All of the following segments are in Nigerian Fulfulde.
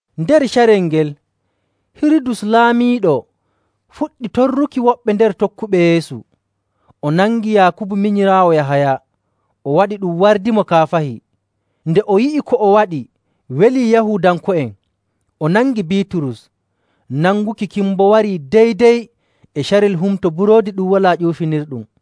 Nder carel ngel, Hirudus laamiiɗo fuɗɗi torruki woɓɓe nder tokkuɓe Yeesu. O nangi Yaakubu minyiraawo Yahaya, o waɗi ɗum wardimo kaafahi. Nde o yi'i ko o waɗi welii Yahuudanko'en, o nangi Biiturus. Nanguki kin boo wari dey‑dey e carel Humto Buroodi Ɗum Walaa Ƴuufinirɗum.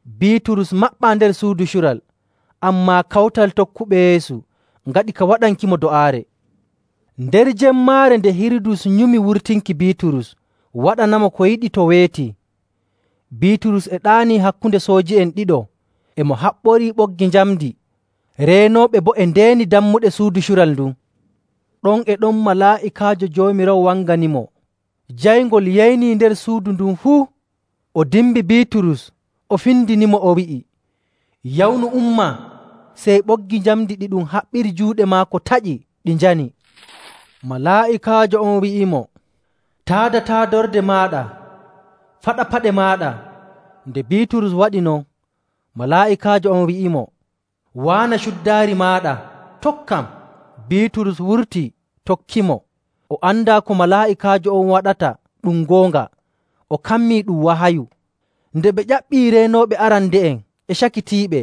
Biiturus maɓɓaa nder suudu cural, ammaa kawtal tokkuɓe Yeesu ngaɗi ka waɗankimo do'aare. Nder jemmaare nde Hirudus nyumi wurtinki Biiturus, waɗanamo ko yiɗi to weeti, Biiturus e ɗaanii hakkunde sooji'en ɗiɗo, e mo haɓɓorii ɓoggi njamndi. Reenooɓe boo e ndeeni dammuɗe suudu cural ndun. Ɗon e ɗon malaa'ikaajo Joomiraawo wanganimo, jayngol yeynii nder suudu ndun fuu. O dimbi Biiturus, o findinimo, o wi'i, “Yawnu, umma!” Sey ɓoggi njamndi ɗiɗum haɓɓiri juuɗe maako taƴi, ɗi njani. Malaa'ikaajo on wi'imo, “Taada taadorde maaɗa, faɗa paɗe maaɗa.” Nde Biiturus waɗi non, malaa'ikaajo on wi'imo, “Waana cuddaari maaɗa, tokkam.” Biiturus wurtii, tokkimo. O andaa ko malaa'ikaajo on waɗata ɗum goonga; o kammi ɗum wahayu. Nde ɓe ƴaɓɓii reenooɓe arande'en e cakitiiɓe,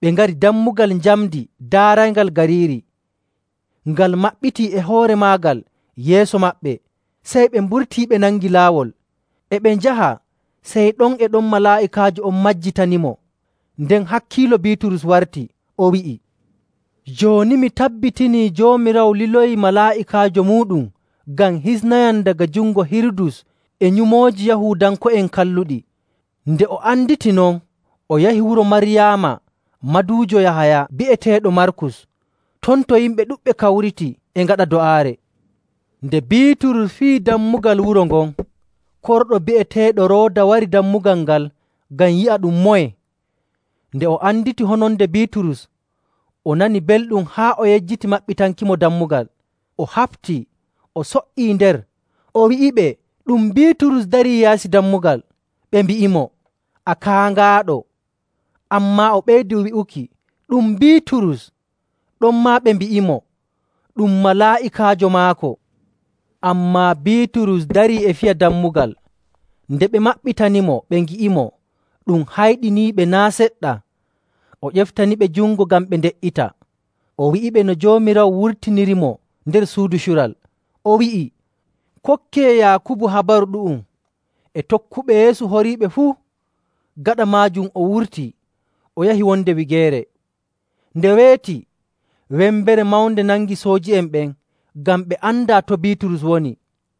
ɓe ngari dammugal njamndi daarayngal gariiri. Ngal maɓɓitii e hoore maagal yeeso maɓɓe, sey ɓe mburtii, ɓe nangi laawol. E ɓe njaha, sey ɗon e ɗon malaa'ikaajo on majjitanimo. Nden hakkiilo Biiturus warti, o wi'i, “Jooni mi tabbitinii Joomiraawo liloyii malaa'ikaajo muuɗum ngam hisnayam daga jungo Hirudus e nyumooji Yahuudanko'en kalluɗi.” Nde o anditi non, o yahi wuro Maryaama, maduujo Yahaya bi'eteeɗo Markus, ton to yimɓe ɗuɗɓe kawriti e ngaɗa do'aare. Nde Biiturus fiyi dammugal wuro ngon, korɗo bi'eteeɗo Rooda wari dammugal ngal ngam yi'a ɗum moye. Nde o anditi hononde Biiturus, o nani belɗum haa o yejjiti maɓɓitankimo dammugal. O haɓtii o so''ii nder, o wi'iɓe ɗum Biiturus darii yaasi dammugal. Ɓe mbi'imo, “A kaaŋaaɗo!” Ammaa o ɓeydi wi'uki ɗum Biiturus. Ɗonmaa ɓe mbi'imo, “Ɗum malaa'ikaajo maako.” Ammaa Biiturus darii e fiya dammugal. Nde ɓe maɓɓitanimo ɓe ngi'imo, ɗum hayɗiniiɓe naa' seɗɗa. O ƴeftaniɓe jungo ngam ɓe nde''ita, o wi'iɓe no Joomiraawo wurtinirimo nder suudu cural, o wi'i, “Kokkee Yaakubu habaru ɗu'um, e tokkuɓe Yeesu horiiɓe fuu.” Gaɗa maajum o wurtii, o yahi wonde wigeere. Nde weeti, wembere mawnde nangi sooji'en ɓen ngam ɓe andaa to Biiturus woni.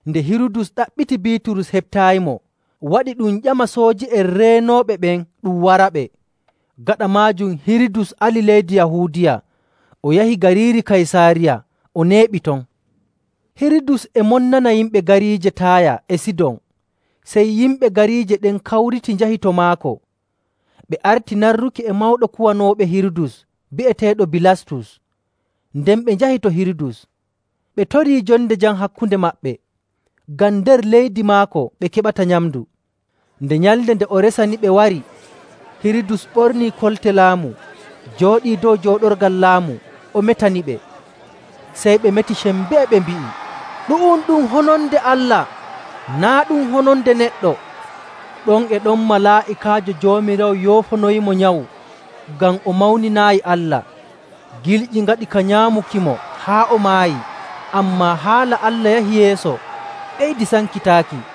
Nde Hirudus ɗaɓɓiti Biiturus heɓtaayimo, waɗi ɗum ƴama sooji'en reenooɓe ɓen ɗum waraɓe. Gaɗa maajum Hirudus ali leydi Yahuudiya, o yahi gariiri Kaysaariya, o neeɓi ton. Hirudus e monnana yimɓe gariije Taaya e Sidon. Sey yimɓe gariije ɗen kawriti njahi to maako. Ɓe arti narruki e mawɗo kuwanooɓe Hirudus bi'eteeɗo Bilastus. Nden ɓe njahi to Hirudus, ɓe torii jonde jam hakkunde maɓɓe, ngam nder leydi maako ɓe keɓata nyamndu. Nde nyalnde nde o resaniɓe wari, Hirudus ɓornii kolte laamu, jooɗii dow jooɗorgal laamu, o metaniɓe. Sey ɓe meti sembee, ɓe mbi'i, “Ɗu'um ɗum hononde allah, naa' ɗum hononde neɗɗo!” Ɗon e ɗon malaa'ikaajo Joomiraawo yoofonoyimo nyawu ngam o mawninaayi Allah. Gilƴi ngaɗi ka nyaamukimo haa o maayi. Ammaa haala Allah yahi yeeso, ɓeydi sankitaaki.